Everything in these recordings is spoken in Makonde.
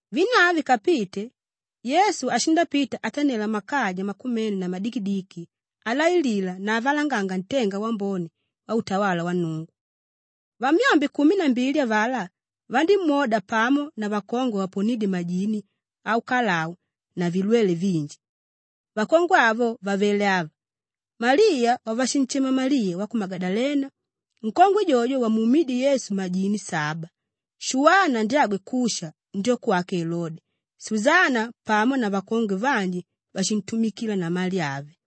Vinu avyo vikapite, Yesu ashindapita atanela makaja makumene na madikidiki alailila na avalanganga ntenga wambone wautawala wa Nnungu. Vamyombe kumi na mbili avalá vandímwoda pamo na vakongwe vavaponídye majini aukalau na vilwele vinji. Vakongwe avo vavele ava: Maliya wavashinshema Maliya wa ku Magadalena nkongwe jojo wamuumídye Yesu majini saba, Shuwana ndyagwe Kusha ndyoko wake Elode, Susana pamo na vakongwe vanji váshintumikila na mali ave.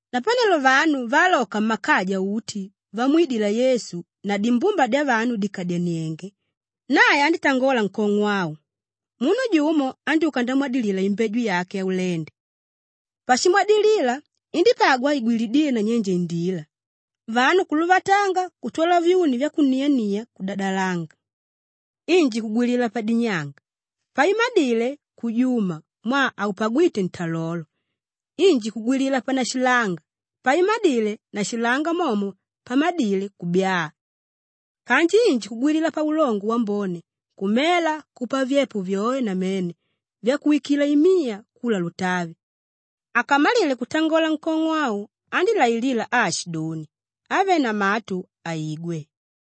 Napanelo vanu vaaloka mmakaja uti vamwidila Yesu na dimbumba dyavanu dìkadyanienge, nae andítangola nkong'o au, “Munu jumo andyúka ndamwadilila imbeju yake yaulende. Pashimwadilila, indípagwa igwilidíle nanyenje indila; vanu kuluvatanga kutwala vyuni vyakuniania kudadalanga. Inji kugwilila padinyanga; paimadile, kujuma mwaa haupagwíte ntalolo. Inji kugwilila panashilanga; paimadile na nashilanga momo pamadile, kubyaa. Kanji inji kugwilila paulongo wambone, kumela, kupa vyepo vyoe namene vyakuwikila imiya kula lutavi.” Akamalile kutangola nkong'o au andílailila aashidoni, “Avé na matu, aigwe.”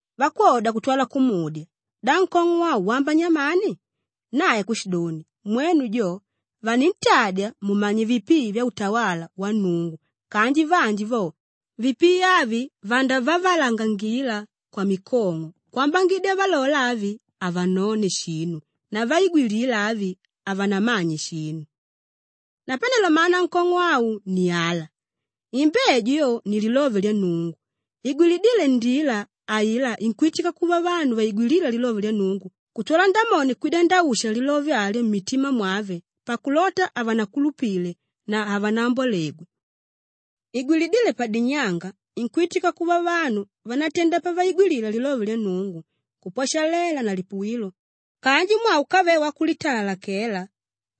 Vakwoda kutwala kumudya, “Da nkong'o au wamba nyamani?” Nae kushidoni, “Mwenu jo vanintadya mumanye vipii vyautawala wa Nnungu kanji vanji vo, ‘vipii avi vandavavalangangila kwamikong'o kwambangidya valola avi, havanone shinu na vaigwilila avi, havanamanye shinu.’ “Napanelo mana ankong'o au ni ala: imbeju yo ni lilove lya Nnungu; igwilidíle ndila ailá inkwitika kuva vanu vaigwilíla lilove lya Nnungu kutwala Ndamoni kwida ndausha lilove alyo mmitima mwave pakulota havanakulupile na havanambwalegwe. Igwilidíle padinyanga inkwitika kuva vanu vánatenda pavaigwilila lilove lya Nnungu, kupwashalela na lipuwilo kanji mwaa úkave wakulitalalakela,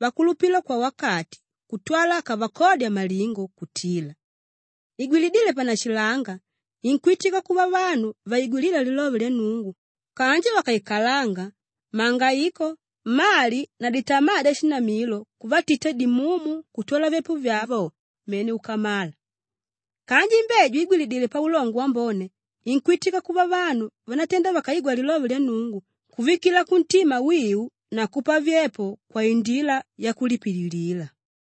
vakulupila kwawakati kutwala akavakodya malingo kutila. Igwilidíle panashilanga inkwitika kuva vanu vaigwilíla lilove lya Nnungu kanji vakaikalanga, mangaiko, mali na ditama dyashinamilo kuvatita dimumu kutwala vyepo vyavo mene kukamala. Kanji imbeju igwilidíle paulongo wambone inkwitika kuva vanu vánatenda vakaigwa lilove lya Nnungu kuvikila kuntima wiu na kupa vyepo kwaindila yakulipililila.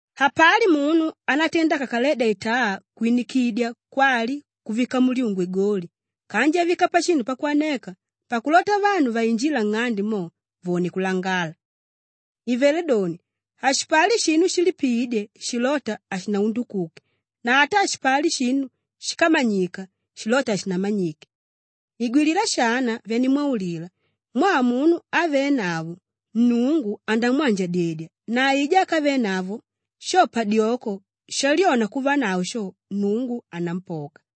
“Hapali munu ánatenda akakaledya itaa kwinikidya kwali kuvika mulyungu igoli kanji avika pashinu pakwaneka pakulota vanu vainjíla nng'ande mo, vone kulangala. Ivelé doni, hashipali shinu shilipiídye shilóta hashinaundukuke na ata hashipali shinu shíkamanyika shilóta hashinamanyike. Igwilila shana vyanimwaulila mwaa munu ávenavo, Nnungu andamwanjadyedya na aijá ákavenavo, sho padyoko shalyona kuvanavo sho, Nnungu anampoka.”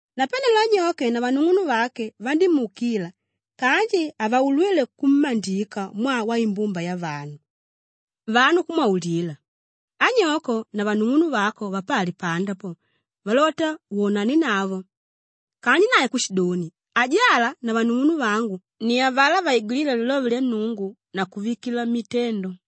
Napanelo anyoke na vanung'unuvake vandímuukila kanji havaulwíle kummandika mwaa waimbumba yavanu. Vanu kumwaulila, “Anyoko pamo na vanung'unuvako vapali panda po, valota wonanenavo.” Kanji nae kushidoni, “Ajala na vanung'unuvangu ni avalá vaigwilíla lilove lya Nnungu na kuvikila mmitendo.”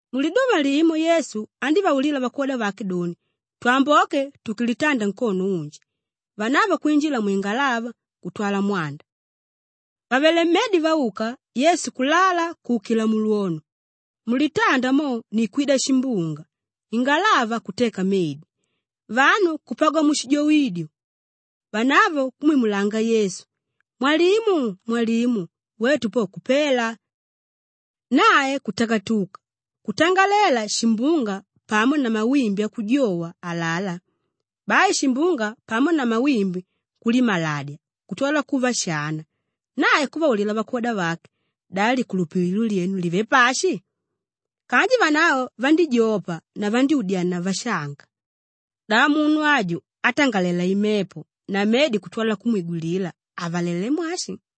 Muliduva limo Yesu andívaulila vakwoda vake doni, “Twamboke tuke litanda nkono unji,” vanavo kwinjila mwingalava kutwala mwanda. Vàvele mmedi vauka, Yesu kulala kuukila mulwono. Mulitanda mo ni kwida shimbunga; ingalava kuteka medi, vanu kupagwa mushijoidyo. Vanavo kumwimulanga Yesu, “Mwalimu, mwalimu! Wetu po kupela!” Nae kutakatuka, kutangalela shimbunga pamo na mawimbi akujowa alalá; bai shimbunga pamo na mawimbi kulimaladya kutwala kuva shana. Nae kuvaulila vakwoda vake, “Da likulupililo lyenu livé pashi?” Kanji vanavo vandíjopa na vandyúdyania vashanga, “Da munu aju átangalela imepo na medi kutwala kumwigwilila, avalalelé mwashi?”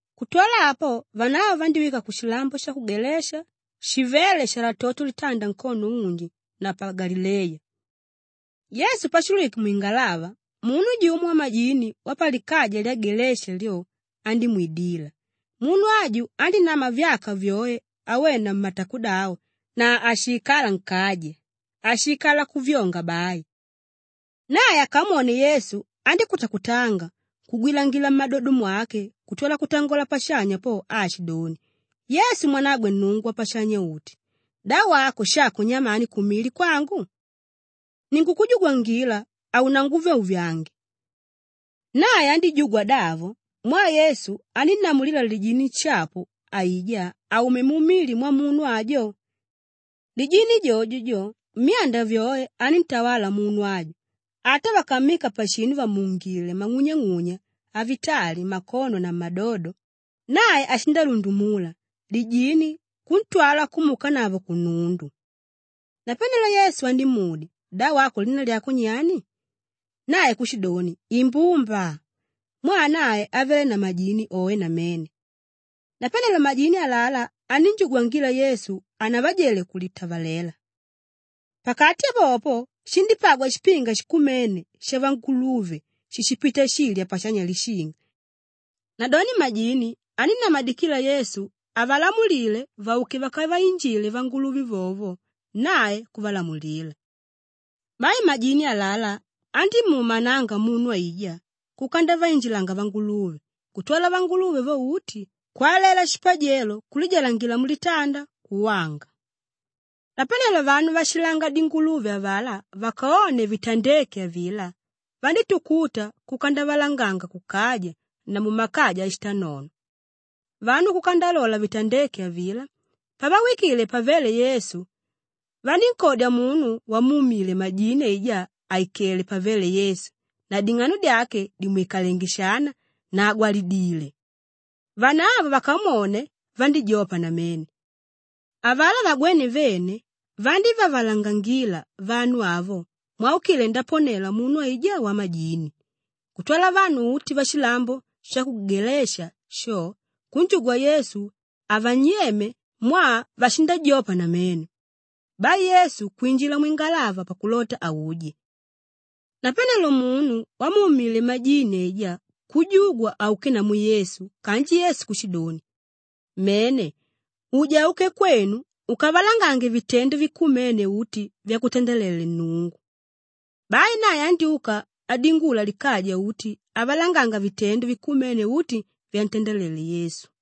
Kutwala apo vanavo vandíwika kushilambo sha ku Gelasha shivéle shalatoto litanda nkono unji na pa Galileya. Yesu pashulwike mwingalava munu jumo wamajini wapalikaja lya Gelasha lyo, andímwidila. Munu aju andínama vyaka vyoe awena matakodavo na hashiikala nkaja; ashiikala kuvyonga bai. Nae akamwone Yesu andíkutakutanga kugwilangila mmadodo mwake kutwala kutangola pashanya po aashidoni, “Yesu mwanagwe Nnungu Wapashanya-uti, da wako shako nyamani kumili kwangu? Ninkukujugwangila haunanguvyauvyange!” Nae andíjugwa davo mwaa Yesu anínnamulila lijini nshapu aijá aume mumili mwamunu ajo. Lijini jojo jo, myanda vyoe aníntawala munu aju; ata vakammika pashinu vàmuungile mang'unyang'unya avitali mmakono na mmadodo, nae ashindalundumula lijini kuntwala kumuukanavo kunundu. Napanelo Yesu andímudya, “Da wako lina lyako nyani?” Nae kushidoni, “Imbumba,” mwaa nae avele na majini oe namene. Napanelo majini alalá anínjugwangila Yesu hanavajele kulitavaleva. Pakati popo, shindípagwa shipinga shikumene shavanguluve shíshipita shilya pashanya lishinga. Nadoni majini anínnamadikila Yesu avalamulile vauke vakavainjile vanguluve vovo nae kuvalamulila. Bai majini alalá andímuumananga munu aijá kuka ndavainjilanga vanguluve kutwala vanguluve vo uti kwalela shipajelo kulijalangila mulitanda, kuwanga. Napanelo vanu váshilanga dinguluve avalá vakone vitandeke avilá, vandítukuta kuka ndavalanganga kukaja na mumakaja ashitanono. Vanu kuka ndalola vitandéke avilá; pavawikile pavéle Yesu, vanínkodya munu wamuumile majini aijá àikele pavéle Yesu na ding'ano dyake dìmwikalenge shana na àgwalangidile. Vanavo vakamwone, vandíjopa namene. Avalá vagwéne vene vandívavalangangila vanu avo mwaukile ndaponela munu aijá wamajini. Kutwala vanu uti vashilambo sha ku Gelasha sho kunjugwa Yesu avanyeme mwaa vashindajopa namene. Bai Yesu kwinjila mwingalava pakulota auje. Napanelo munu wamuumile majini aijá kujugwa auke namu Yesu kanji Yesu kushidoni, “Mene! Uja uke kwenu ukavalangange vitendo vikumene uti vyakutandelele Nnungu.” Bai nae andyúka adingula likaja uti avalanganga vitendo vikumene uti vyantandalele Yesu.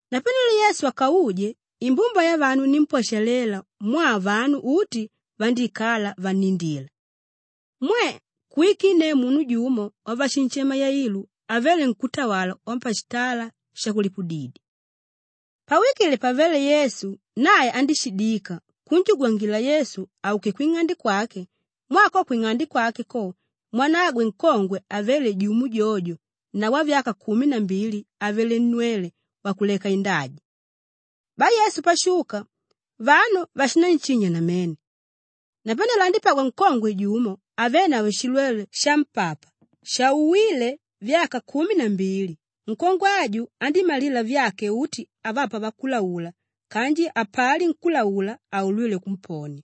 Napanelo Yesu akauje, imbumba yavanu inímpwashalela mwaa vanu uti vandíikala vannindila. Mwe! Kuwikinneu munu jumo wavashinshema Yailu avele nkútawala wapashitala shakulipudidya. Pawikile pavéle Yesu nae andíshidika kunjugwangila Yesu auke kwing'ande kwake mwaa ko kwing'ande kwake ko, mwanagwe nkongwe ávele jumo jojo na wavyaka kumi na mbili avele nnwele wakuleka indaja. Bai Yesu pashuka, vanu vashinanshinya namene. Napanelo andípagwa nkongwe jumo ávenavo shilwele shampapa shauwile vyaka kumi na mbili; nkongwe aju andímalila vyake uti avapa vakulaula kanji hapali nkúlaula áulwile kumponia.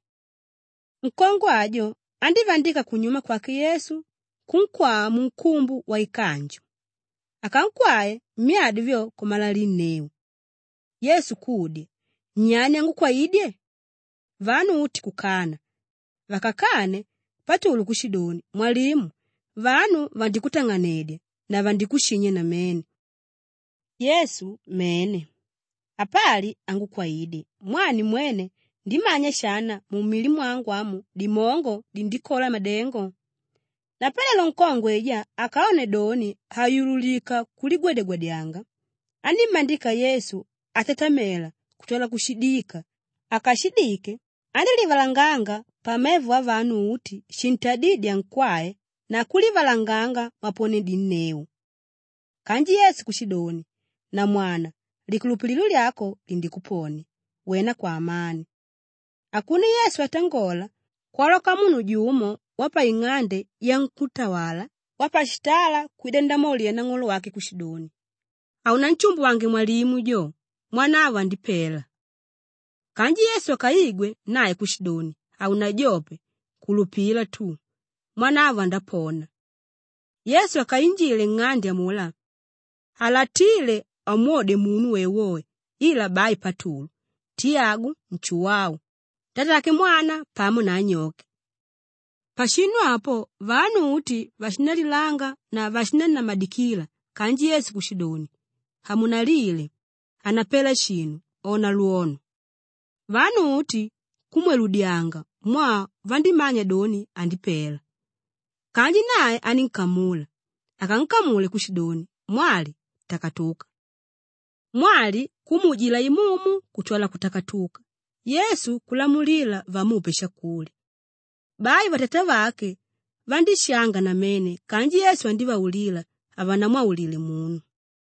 Nkongwe ajo andívandika kunyuma kwake Yesu kunkwaa munkumbu waikanju; akankwae, myadi vyo kumalalinneu. Yesu kudya, “Nyani ángukwaidye?” Vanu uti kukana. Vakakane, Patulu kushidoni, “Mwalimu! Vanu vandikutang'anedya na vandikushinya namene!” Yesu, “Mene, apali ángukwaidye mwaa nimwene ndimanya shana, mumili mwangu amu dimongo dindikola madengo.” Napanelo nkongwe aijá akone doni hayululika kuligwadyagwadyanga, anímmandika Yesu atatamela kutwala kushidika; akashidike, andílivalanganga pamevo avanu uti shintadídye ankwae na kulivalanganga mwaponedinneu. Kanji Yesu kushidoni, “Namwana, likulupililo lyako lindikuponia; wena kwaamani.” Akune Yesu atangola, kwaloka munu jumo wapaing'ande yankútawala wapashitala kwida ndamwaulila nang'olo wake kushidoni, “Haunanshimbuwange mwalimu jo, mwanavo andipela.” Kanji Yesu akaigwe nae kushidoni, “Haunajope; kulupila tu. Mwanavo andapona.” Yesu akainjile nng'ande amulá, halatíle amwode munu woewoe ila bai Patulu, Tiyagu, Nshuwau, tatake mwana pamo na anyoke. Pashinu apo vanu uti vashindalilanga na vashinannamadikila kanji Yesu kushidoni, “Hamunalile! Hanapela shinu, ona lwono.” Vanu uti kumweludyanga mwaa vandímanya doni, andipela. Kanji nae anínkamula; akankamule kushidoni, “Mwali, takatuka!” Mwali kumuujila imumu kutwala kutakatuka, Yesu kulamulila vamupe shakulya. Bai vatatavake vandíshanga namene kanji Yesu andívaulila havanamwaulile munu.